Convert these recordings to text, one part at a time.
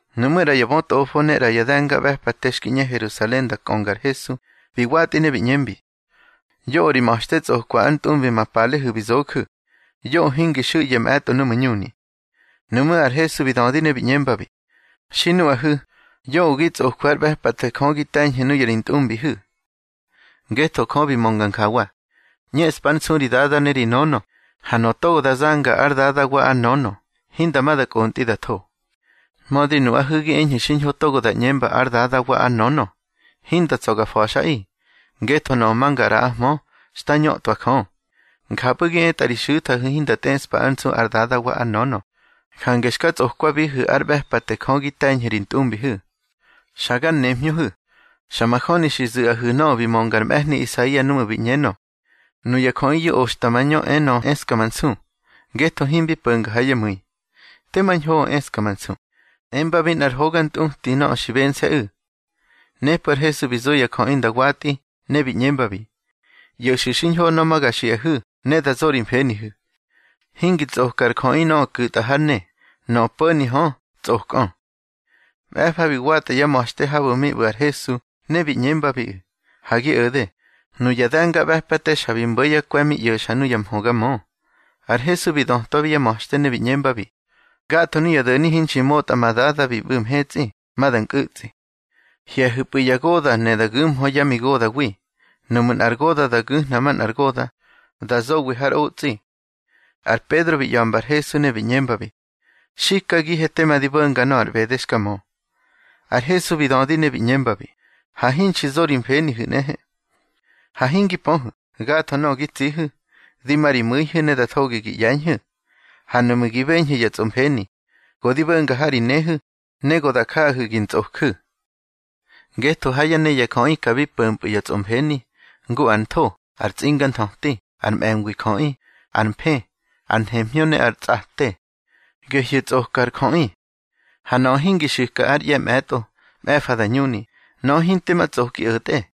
Nuꞌmú̱ ꞌra ya bötꞌofo ne ꞌra ya de̱ngaꞌbe̱pate xki ꞌñe Herusalen nda kꞌönga ar Hesu, bi watꞌi ne bi ꞌñembi: —Yoꞌö ri ma̱xte tsꞌokwa ár ntꞌumbi ma palehu̱ bi zoju̱. Yoꞌö hingi xu̱ꞌye̱ mꞌe̱tꞌo núꞌmu̱ ñuni. Nuꞌmú̱ ar Hesu bi dödi ne bi ꞌñembabi: —Xi nuꞌahu̱, yoꞌö gi tsꞌojwu̱ ár ꞌbe̱pate Jö gi te̱ñhu̱ nuya ri ntꞌumbihu̱. Ngetho Jö bi mönga njawa: ꞌÑeꞌspa ár nsu ri dada ne ri nönö, ha nöꞌö togo da zanga ár dada wa ár nönö, hinda ma da kꞌontꞌi da tho. Mödi nuꞌahu̱ gi eñhu̱ xiñho togo da ꞌñemba ár dada wa ár nönö: Hinda tsa̱ ga fa̱xꞌaꞌi, ngetho nöꞌö ma nga ꞌraꞌahmö, xta ñötꞌwa Jö. Njapꞌu̱ gi etꞌa ri xu̱thahu̱ hinda tꞌeꞌspa ár nsu ár dada wa ár nönö. Jange xka tsꞌokwabihu̱ ár ꞌbe̱pate Jö gi te̱ñhu̱ ri ntꞌumbihu̱. Xa gar nemhñöhu̱. Xa majöni xi zu̱ꞌahu̱ nöꞌö bi mönga ar mꞌe̱hni Isaia núꞌmu̱ bi ꞌñenö: Nuya jöꞌiyu̱ oxta mañö enö eska ma nsu, ngetho himbi po̱nga ha yá mu̱i. Tema ñhoꞌö eska ma nsu, embabi nꞌar hoga ntꞌuti nöꞌö xi bense̱ꞌu̱. Nepꞌu̱ ar Hesu bi zo ya jöꞌi nda watꞌi, ne bi ꞌñembabi: —ꞌYo̱xu̱ xiñho nöꞌö ma ga xiꞌahu̱, ne da zo ri mfenihu̱. Hingi tsꞌoka ar jöꞌi nöꞌö ku̱tꞌa hár ne. Nöꞌö po̱ni hö, tsꞌokꞌö. Mꞌe̱fa bi watꞌa yá ma̱xte habu̱ mi ꞌbu̱ ar Hesu, ne bi ꞌñembabiꞌu̱: —Ha gi o̱de, nuya de̱ngaꞌbe̱pate xa bi mbo̱ yá kwe̱ mi ꞌyo̱xa nuya mhö ga mö. Ar Hesu bi dötwabi yá ma̱xte ne bi ꞌñembabi: —Gatho nuya do̱ni hinxi motꞌa ma dada bi ꞌbu̱ mhetsꞌi, ma da nkꞌu̱tsꞌi. Hye̱hu̱pꞌu̱ ya goda̱ ne da gu̱mhö yá migoda̱wi. Nuꞌmu̱ nꞌar goda̱ da gu̱hna manꞌar goda̱, da zowi har otsꞌi. Ar Pedro bi ꞌya̱mba ar Hesu ne bi ꞌñembabi: —Xikagihe tema di bo̱nga nöꞌö ar ꞌbede xka mö. Ar Hesu bi dödi ne bi ꞌñembabi: —Ha hinxi zo ri mfenihu̱ nꞌehe. Ha hingi pöhu̱, gatho nöꞌö gi tsihu̱, di ma ri mu̱ihu̱ ne da thogi gi ꞌye̱ñhu̱. Ha nuꞌmu̱ gi beñhu̱ ya tsꞌomfeni, go di bo̱nga ha ri nehu̱, ne go da jaꞌahu̱ gi ntsꞌoju̱. Ngetho ha yá ne ya jöꞌi ka bi po̱mpꞌu̱ ya tsꞌomfeni, ngu ar ntho, ar tsꞌinga nthöti, ar mꞌe̱ngwi jöꞌi, ar mfë, ar nhemhñö ne ar tsꞌate. Gehyu̱ tsꞌoka ar jöꞌi. Ha nöꞌö hingi xu̱ka ár ꞌye̱ mꞌe̱tꞌo, mꞌe̱fa da ñuni, nöꞌö hinte ma tsꞌoki o̱tꞌe.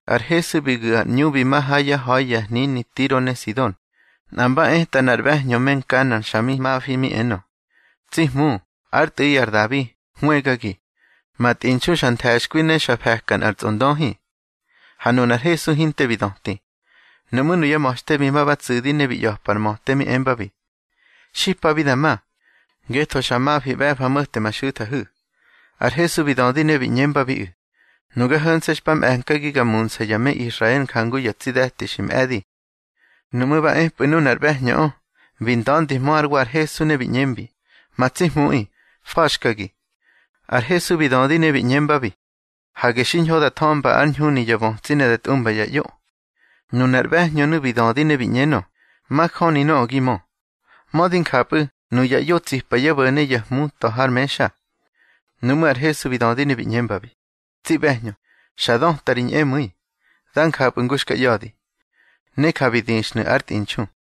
Ar Hesu bi gu̱ ar ꞌñu bi ma ha yá ha̱i ya hnini Tiro ne Sidon. Nꞌa mba eta nꞌar ꞌbe̱hñö me Nkanan xa mi mafi mi enö: —Tsi Hmu, ár Tꞌu̱ꞌi ar Dabi, hwëgagi. Ma tꞌinxu xa nthe̱xkwi ne xa fe̱ka nꞌar tsꞌondöhi. Ha nunar Hesu hinte bi döti. Nuꞌmú̱ nuyá ma̱xte bi ma ba tsu̱di ne bi ꞌya̱pa ar möte mi embabi: —Xipabi da ma, ngetho xa mafi ꞌbe̱fa mo̱te ma xu̱thahu̱. Ar Hesu bi dödi ne bi ꞌñembabiꞌu̱: —Nuga ho̱nse̱ xpa mꞌe̱nkagi ga munsa ya me Israel jangu ya tsi de̱ti xi mꞌe̱di. Nuꞌmú̱ ba epꞌu̱ nunar ꞌbe̱hñöꞌö, bi nda̱ndihmö hár wa ar Hesu, ne bi ꞌñembi: —Ma tsi Hmuꞌi, fa̱xkagi. Ar Hesu bi dödi ne bi ꞌñembabi: —Hage xiñho da thömba ár ñhuni ya bötsi ne da tꞌumba ya ꞌyo. Nunar ꞌbe̱hñönu̱ bi dödi ne bi ꞌñenö: —Majöni nöꞌö gi mö. Mödi njapꞌu̱, nuya ꞌyo tsipa yá bo̱ne yá hmu ta̱ har mexa. Nuꞌmú̱ ar Hesu bi dödi ne bi ꞌñembabi: —Tsi ꞌbe̱hñö, xa döta ri ñꞌemu̱i. Dá njapꞌu̱ ngu xka ꞌya̱di. Ne ja bi dixnu̱ ár tꞌinxu.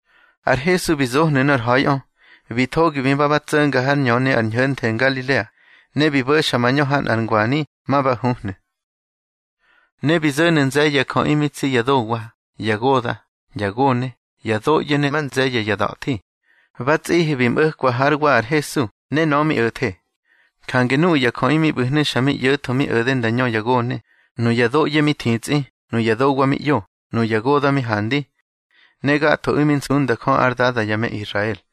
Ar Hesu bi zohnu̱ nor ha̱iꞌö, bi thogi bi ma ba tso̱nga hár ñöni ar ñho̱nthe Ngalilea, ne bi bo̱xa mañö ha nꞌar ngwani, ma ba huhnu̱. Ne bi zo̱nu̱ nze̱ye̱ ya jöꞌi mi tsi ya dowa, ya goda̱, ya gone, ya doꞌye̱ ne ma nze̱ye̱ ya da̱thi. Ba tsꞌihi bi mꞌo̱kwa hár wa ar Hesu, ne nöꞌö mi o̱the. Jange nuꞌu̱ ya jöꞌi mi ꞌbu̱hnu̱ xa mi ꞌyo̱tho mi o̱de nda ñö ya gone, nuya doꞌye̱ mi thitsꞌi, nuya dowa mi ꞌyo, nuya goda̱ mi handi. Ne gathoꞌu̱ mi nsunda Jö ár Dada ya me Israel.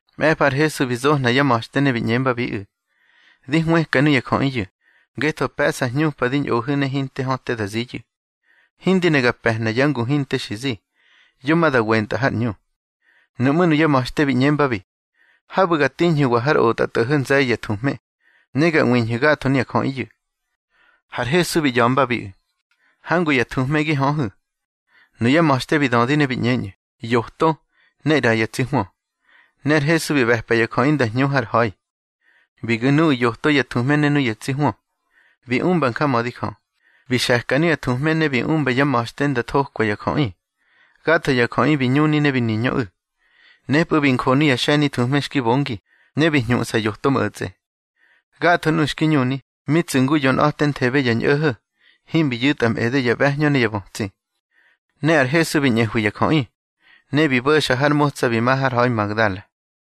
Mꞌe̱fa ar Hesu bi zohna yá ma̱xte ne bi ꞌñembabiꞌu̱: —Di hwëka nuya jöꞌiyu̱, ngetho pe̱ꞌsa hñupa di ñꞌohu̱ ne hinte hö te da ziyu̱. Hindi ne ga pe̱hna yá ngu hinte xi zi, yo ma da wentꞌa har ꞌñu. Nuꞌmú̱ nuyá ma̱xte bi ꞌñembabi: —Habu̱ ga tiñhu̱wa har otꞌatꞌo̱ho̱ nze̱ye̱ ya thuhme, ne ga ꞌwiñhu̱ gatho nuya jöꞌiyu̱. Har Hesu bi ꞌya̱mbabiꞌu̱: —Hangu ya thuhme gi höhu̱. Nuyá ma̱xte bi dödi ne bi ꞌñeñꞌu̱: —Yoto, ne ꞌra ya tsi hwö. Ne ar Hesu bi ꞌbe̱pa ya jöꞌi nda hñu har ha̱i. Bi gu̱ nuꞌu̱ yoto ya thuhme ne nuya tsi hwö, bi umba njamödi Jö, bi xe̱ka nuya thuhme ne bi umba yá ma̱xte nda thokwa ya jöꞌi. Gatho ya jöꞌi bi ñuni ne bi niñöꞌu̱. Nepꞌu̱ bi njo nuya xe̱ni thuhme xki bongi, ne bi ñhuꞌsa yoto mꞌo̱tsꞌe. Gatho nuꞌu̱ xki ñuni, mi tsu̱ ngu yonꞌa̱tenthebe ya ñꞌo̱ho̱, himbi yu̱tꞌar mꞌede ya ꞌbe̱hñö ne ya bötsi. Ne ar Hesu bi ñꞌehwi ya jöꞌi, ne bi bo̱xa har motsa bi ma har ha̱i Magdala.